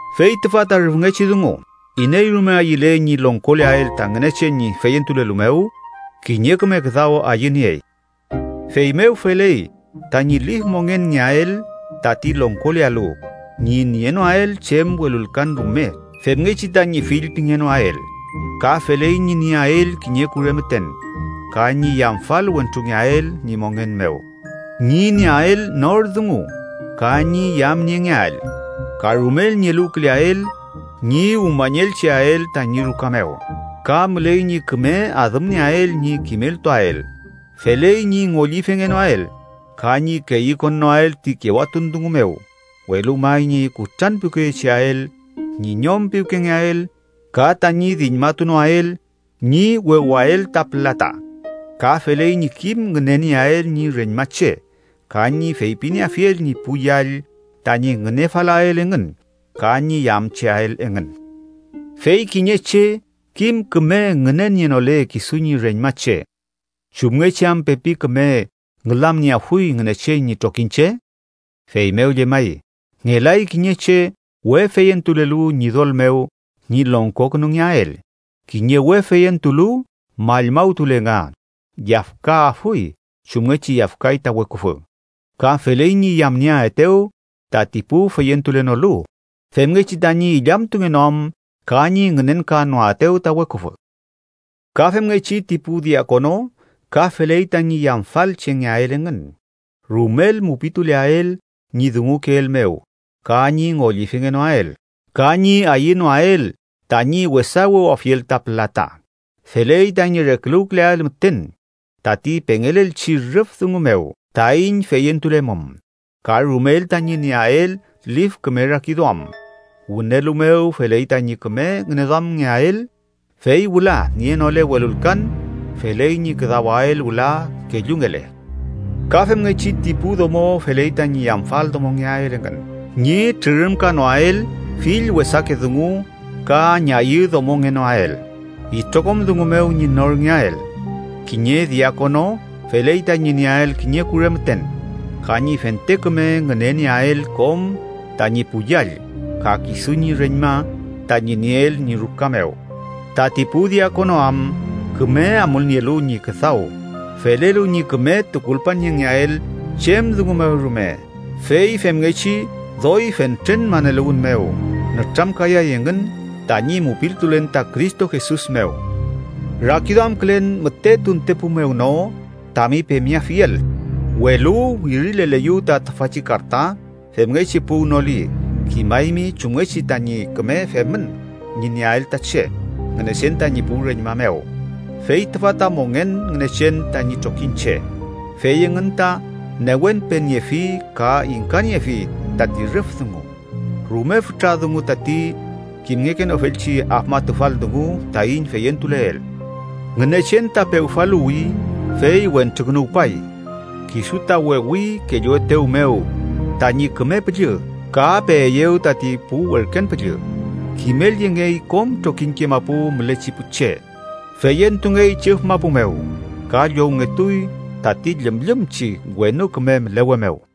Fey tüfa ta rüfngechi dungu: iney rume ayüle ñi longkoleael ta Ngünechen ñi feyentulelu mew, kiñe küme küdaw ayüniey. Feymew feley tañi lif mongenngeael, tati longkolealu ñi nienoael chem welulkan rume femngechi tañi fillpingenoael. Ka feley ñi nieael kiñe kure müten ka ñi yamfal wentrungeael ñi mongen mew, ñi nieael nor dungu ka ñi yamniengeael. Ka rumel ñi eluwküleael ñi umañelcheael tañi ruka mew. Ka müley ñi küme adümnieael ñi kimeltuael. Feley ñi ngollifengenoael ka ñi keyükonnoael ti kewatun dungu mew, welu may ñi kutranpiwkeyecheael, ñi ñom piwkengeael ka tañi diñmatunoael ñi wewael ta pülata. Ka feley ñi kim ngünenieael ñi reñmache ka ñi feypinieafiel ñi pu yall tañi ngünefalael engün ka ñi yamcheael engün. Fey kiñe che kim küme ngünenienole kisu ñi reñmache, ¿chumngechi am pepi küme ngülamnieafuy Ngünechen ñi trokiñche? Feymew llemay, ngelay kiñe che we feyentulelu Ñidol mew ñi longkokünungeael. Kiñe we feyentulu mallmawtule nga, yafkaafuy chumngechi yafkay ta Weküfü. Ka feley ñi yamnieaetew tati pu feyentulenolu, femngechi tañi illamtungenoam ka ñi ngünenkanoaetew ta weküfü. Ka femngechi ti pu diakono ka feley tañi yamfal chengeael engün, rumel mupituleael ñi dungukeel mew ka ñi ngollifengenoael ka ñi ayünoael tañi wesa wewafiel ta pülata. Feley tañi reküluwküleael müten tati pengelelchi rüf dungu mew taiñ feyentulemum, ka rumel tañi nieael lif küme rakiduam. Wünelu mew feley tañi küme ngüneduamngeael, fey wüla, nienole welulkan, feley ñi küdawael wüla kellungele. Ka femngechi, ti pu domo feley tañi yamfal domongeael engün, ñi trürümkanoael fill wesake dungu ka ñayüdomongenoael, itrokom dungu mew ñi norngeael. Kiñe diakono feley tañi nieael kiñe kure müten, ka ñi fente küme ngünenieael kom tañi pu yall ka kisu ñi reñma tañi nieel ñi ruka mew. Tati pu diakono am küme amulnielu ñi küdaw, felelu ñi küme tukulpaniengeael chem dungu mew rume, fey femngechi doy fentren maneluwün mew nütramkayay engün tañi mupiltulen ta Cristo Jesus mew. Rakiduamkülen müte tuntepu mew no tami pemeafiel, welu wirileleyu ta tüfachi karta femngechi puwnoli, kimaymi chumngechi tañi küme femün ñi nieael ta che Ngünechen tañi pu reñma mew, fey tüfa ta mongen Ngünechen tañi trokiñche, fey engün ta newenpeniefi ka ingkaniefi tati rüf dungu. Rume fütra dungu tati kimngekenofelchi afmatufal dungu taiñ feyentuleel: Ngünechen ta pewfaluwi fey wentrukünuwpay, kisu ta wewi kelluetew mew tañi Küme Püllü ka peeyew tati pu werken püllü. Kimelyengey kom trokiñke mapu mülechi pu che, feyentungey chüf mapu mew, ka llowngetuy tati llümllümchi wenu küme mülewe mew.